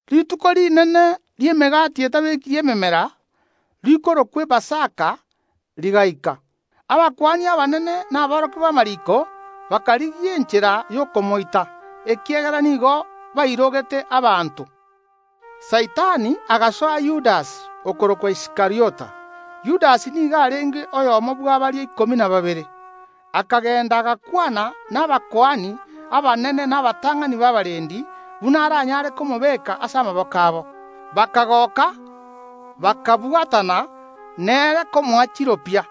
Rituko Rinene ri’Emegati etabekiri memera, rikorokwa Epasaka, rigaika. Abakuani abanene na aborokia b’amariiko bakarigia enchera y’okomoita, ekiagera nigo bairogete abanto. Saitani agasoa Yudasi okorokwa Iskariota. Yudasi nigo arenge oyomo bwa baria ikomi na babere. Akagenda agakwana nabakuani abanene na abatang’ani b’abarendi buna aranyare komobeeka ase amaboko abo. Bakagoka bakabwatana nere komoa chiropia.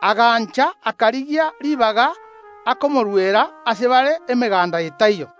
Agancha, akarigia ribaga akomoruera ase bare emeganda etaiyo.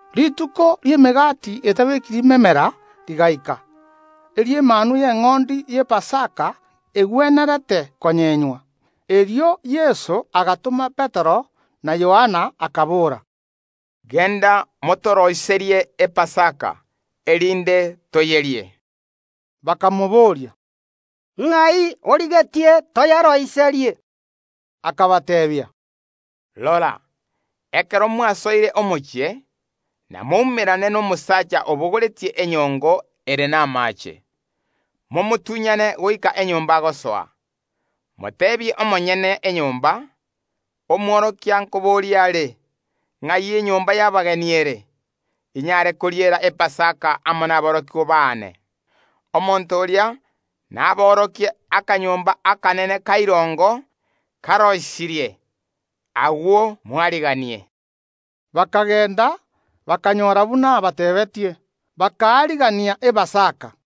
Rituko ri’Emegati etabekiri memera rigaika, eri’emanwa y’eng’ondi y’Epasaka egwenerete konyenywa. Erio Yeso agatoma Petero na Yohana, akabora, “Genda motoroiserie Epasaka, erinde toyerie.” Bakamobooria, “Ng’ai origetie toyeroiserie?” Akabateebia, “Rora, ekero mwasoire omochie, namoumerane nomosaacha obogoretie enyongo ere namaache; momotunyane goika enyomba agosoa, moteebie omonyene enyomba: Omworokia nkoboria are: Ng’ai enyomba y’abageni ere, inyare koriera Epasaka amo naborokigwa baane? Omonto oria naboorokie akanyomba akanene ka irongo karoisirie; agwo moariganie.” Bakagenda, bakanyora buna abateebetie, bakaarigania Epasaka.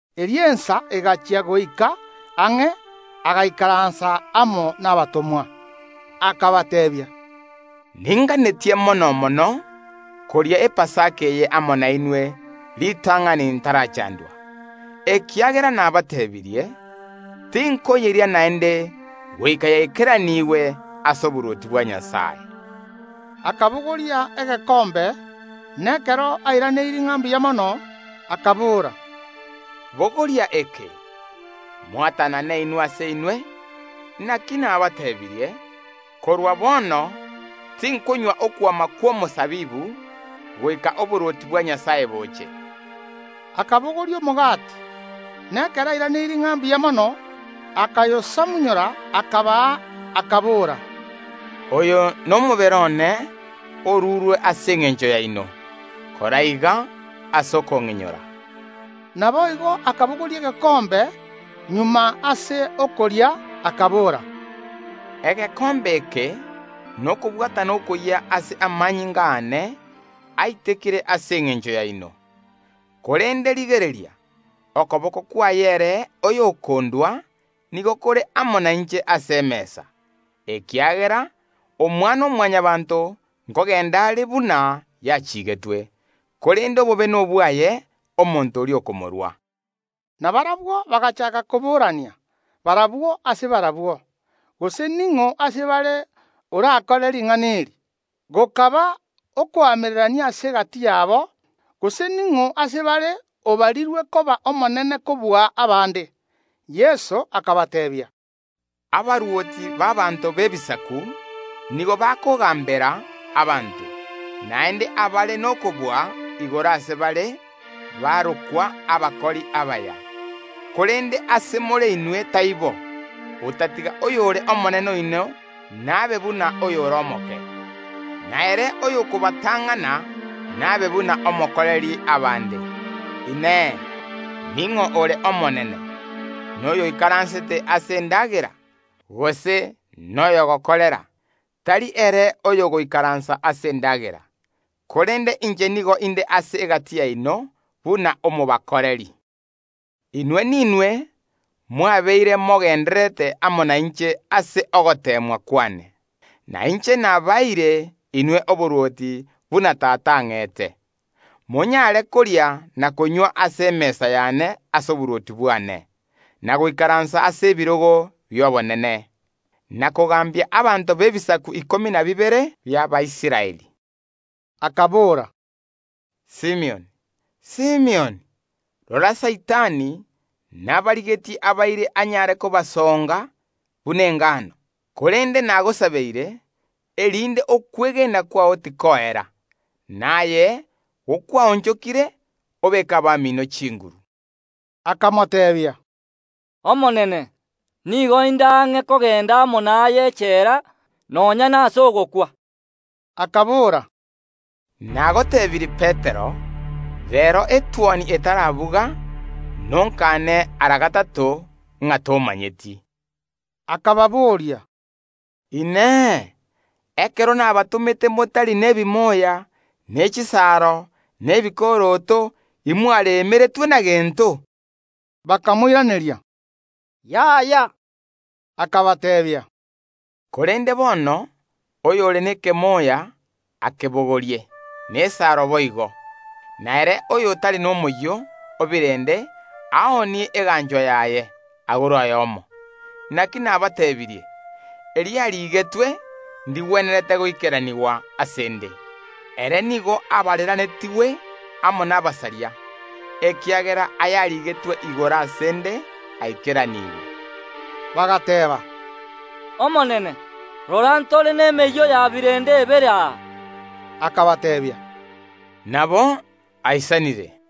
Erio ensa egachia goika ang’e, agaikaransa amo nabatomwa. Akabateebia, “Ninganetie mono koria Epasaka eye amo nainwe ritang’ani ntarachaandwa, ekiagera nabateebirie, tinkoyeria naende goika yaikeranigwe ase oborwoti bwa Nyasae.” Akabogoria egekombe, na ekero airaneirie ng’a mbuya mono, akabora, “Bogoria eke, mosaange inwe ase inwe; naki nabateebirie, korwa bono tinkonywa okwama kw’omosabibu goika oborwoti bwa Nyasae boche.” Akabogoria omogati, na ekero airaneirie ng’a mbuya mono, akayosamunyora, akabaa, akabora, “Oyo nomobere one orurwe ase engencho yaino. [Kora iga ase okong’inyora.” Naboigo akabogoria egekombe magega ase okoria, akabora, “Egekombe eke nokobwatana okoyia ase amanyinga aane, aitekire ase engencho yaino.] Korende rigereria, okoboko kwaye ere oyokondua nigo kore amo nainche ase emesa. Ekiagera Omwana‐o‐Mwanyabaanto nkogenda are buna yachiigetwe; korende obobe nobwaye omonto oria okomorua!” Na barabwo bagachaaka koborania barabwo ase barabwo, gose ning’o ase bare orakore ring’ana eri. Gokaba okoamererania ase egati yabo, gose ning’o ase bare obarirwe koba omonene kobua abande. Yeso akabateebia, “Abarwoti b’abaanto b’ebisaku nigo bakogambera abanto; naende abare nokobua igoro ase bare barokwa Abakori Abaya. Korende ase more inwe taibo, otatiga oyore omonene oino nabe buna oyore omoke; na ere oyokobatang’ana nabe buna omokoreri abande. Inee! Ning’o ore omonene, noyoikaransete ase endagera, gose noyogokorera? Tari ere oyogoikaransa ase endagera? Korende inche nigo inde ase egati yaino buna omokoreri. “Inwe ninwe mwabeire mogendererete amo nainche ase ogoteemwa kwane, na inche nabaeire inwe oborwoti buna Tata ang’ete, monyaare koria na konywa ase emesa yane ase oborwoti bwane, na goikaransa ase ebirogo bi’obonene, na kogambia abanto b’ebisaku ikomi na bibere bi’Abaisraeli.” Akabora, “Simioni, Simioni, rora Saitani nabarigetie abaire anyaare kobasoonga buna engano, korende nagosabeire, erinde okwegena kwao tikoera, na aye gokwaonchokire, obeeke abamiino chinguru.” Akamoteebia, “Omonene nigo inde ang’e kogenda amo naye echela, nonya nase ogokwa.” Akabora, “Nagotebirie Petero, reero etuoni etarabuga nonkane ara gatato ng’a tomanyeti.” Akababoria, “Inee! Ekero nabatomete motari nebimoya, ne chisaaro, na ebikoroto, imwaremeretwe na gento?” Bakamoiraneria, “Yaya”. Akabateebia, “Korende bono oyore nekemoya akebogorie, na esaro boigo, na ere oyotari nomoyio o birende aoonie eganchwa yaye, agore oyomo. Naki nabateebirie, eriarigetwe ndigwenerete goikeranigwa ase ’nde. Ere nigo abareranetigwe amo nabasaria, ekiagera ayarigetwe igoro ase ’nde aikeranigwe.” Bagateeba, “Omonene, rora ntore nemeyio ya birende ebere aa.” Akabateebia, “Nabo aisanire.”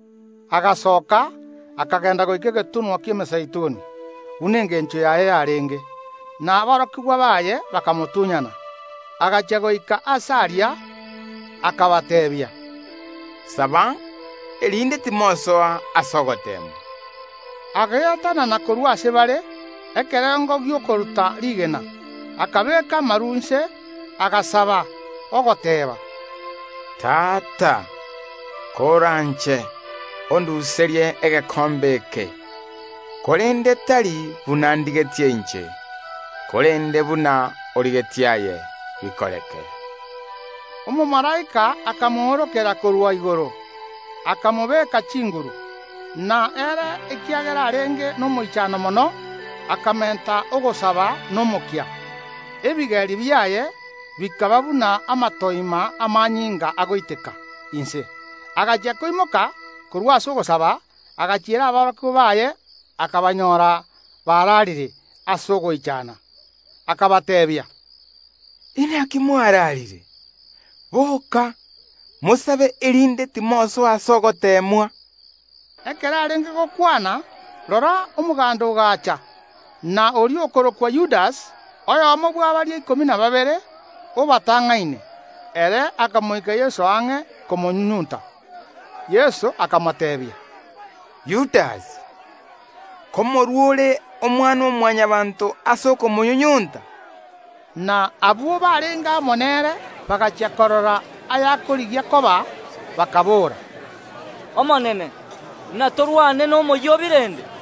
Agasooka, akagenda goika egetunwa ki’Emezeituni, buna engencho yaye yarenge, na aborokigwa baye bakamotunyana. Agachia goika aase aria akabateebia, “Saba, erinde timosoa ase ogoteemwa.” Ageatanana korwa ase bare, ekerengo gi’okoruta rigena, akabeeka amaru inse, agasaba, ogoteeba, “Tata, koranche, onduserie egekombe eke, korende tari buna ndigetie inche, korende buna origetie aye, bikoreke.” Omomalaika akamoorokera korwa, igoro, akamobeka chinguru. Na ere ekiagera arenge nomoichano mono, akamenta ogosaba nomokia; ebigeri biaye bikaba buna amatoima y’amanyinga agoiteka inse. Agachia koimoka korwa ase ogosaba agachiera aborokigwa baye, akabanyora bararire ase ogoichana. Akabateebia, “Inaki mwararire? Boka, mosabe, erinde timosoa ase ogoteemwa.” Ekero arenge gokwana, rora, omoganda ogaacha, na oria okorokwa Yudasi, oyomo bwa baria ikomi na babere, obatang’aine. Ere akamoika Yeso ang’e komonyunyunta. Yeso akamoteebia, “Yudasi, nkomorua ore Omwana‐o‐Mwanyabaanto ase okomonyunyunta?” Na abwo barenge amo nere bagachia korora ayakorigia koba, bakaboora, “Omonene, inatorwane nomoyio o birende?”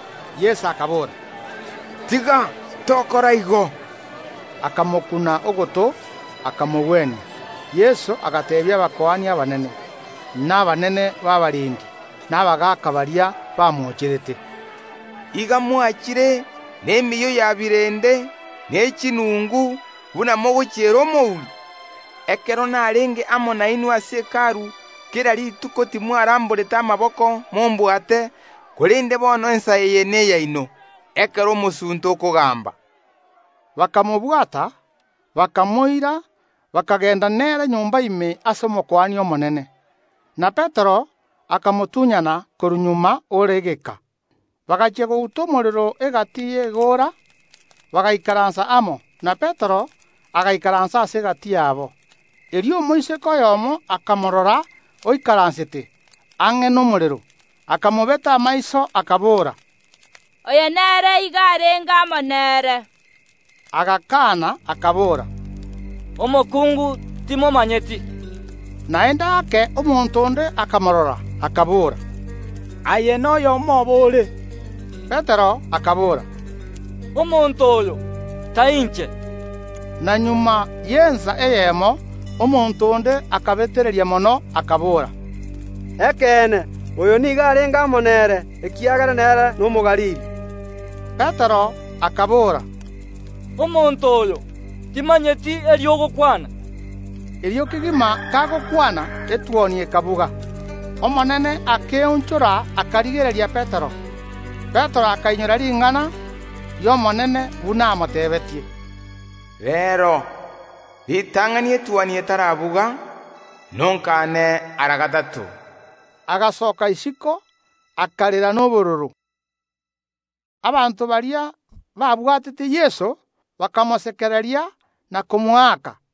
Yeso akabora, “Tiga tokora igo.” Akamokuna ogoto, akamogwenia. Yeso agateebia abakuani abanene, na abanene b’abarendi be Hekalu, na abagaaka, baria bamoocherete, “Iga mwachire nemeyio ya birende ne chinungu buna mogochiera omouri. Ekero narenge amo nainwe ase Hekalu kera rituko timwaramborete amaboko mombwate, korende bono ensa eye neyaino, ekero omosunte okogamba.” Bakamobwata, bakamoira, bakagenda nere nyomba ime ase Omokuani omonene. Na Petero akamotunyana korwa magega ore egeka. Bagachia gouta omorero egati y’egoora, bagaikaransa amo, na Petero agaikaransa ase egati yabo. Erio omoiseke oyomo akamorora oikaransete ang’e nomorero, akamobeta amaiso akabora, “Oyo nere igo arenge amo nere.” Agakana, akabora, “Omokungu, timomanyeti.” Naende ake omonto onde akamorora, akabora, “Aye noyomo obo ore.” Petero akabora, “Omonto oyo, tai inche.” Na magega y’ensa eyemo, omonto onde akabetereria mono, akabora, “Ekeene, oyo nigo arenge amo nere, ekiagera nere n’Omogalili.” Petero akabora, “Omonto oyo, timanyeti eri ogokwana.” Erio kegima kagokwana, etuoni ekabuga. Omonene akeonchora, akarigereria Petero. Petero akainyora ring’ana ri’Omonene, buna amoteebetie, “Reero, ritang’ani etuoni etarabuga nonkaane ara gatato.” Agasoka isiko, akarera nobororo. Abanto baria babwatete Yeso, bakamosekereria, na komoaka.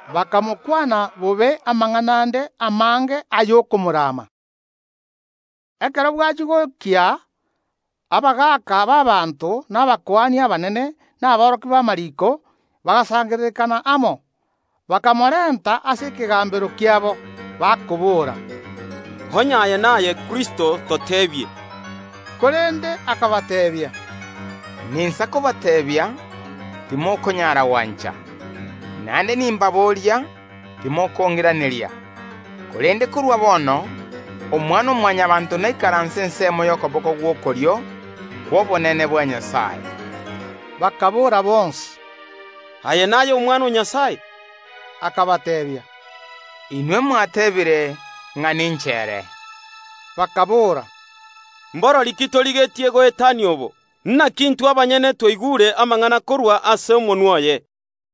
Bakamokwana bobe amang’ana ande amange ay’okomorama. Ekero bwachia gokia, abagaaka b’abaanto, na abakuani abanene, na aborokia b’amariiko bagasangererekana amo, bakamorenta ase ekegambero kiabo, bakoboora, “Onye aye naye Kristo, toteebie.” Korende akabateebia, “Ninsa kobateebia, timokonyaara gwancha; naende nimbaboria, timokong’iraneria. Korende korwa bono Omwana‐o‐Mwanyabaanto naikaranse ensemo y’okoboko gw’okorio kw’obonene bwa Nyasae.” Bakaboora bonsi, “Aye naye Omwana o Nyasae.” Akabateebia, “Inwe mwateebire ng’a ninche ere.” Bakaboora, “Mborori ki torigetie goetania obo? Naki intwe abanyene twaigure amang’ana korwa ase omonwa oye.”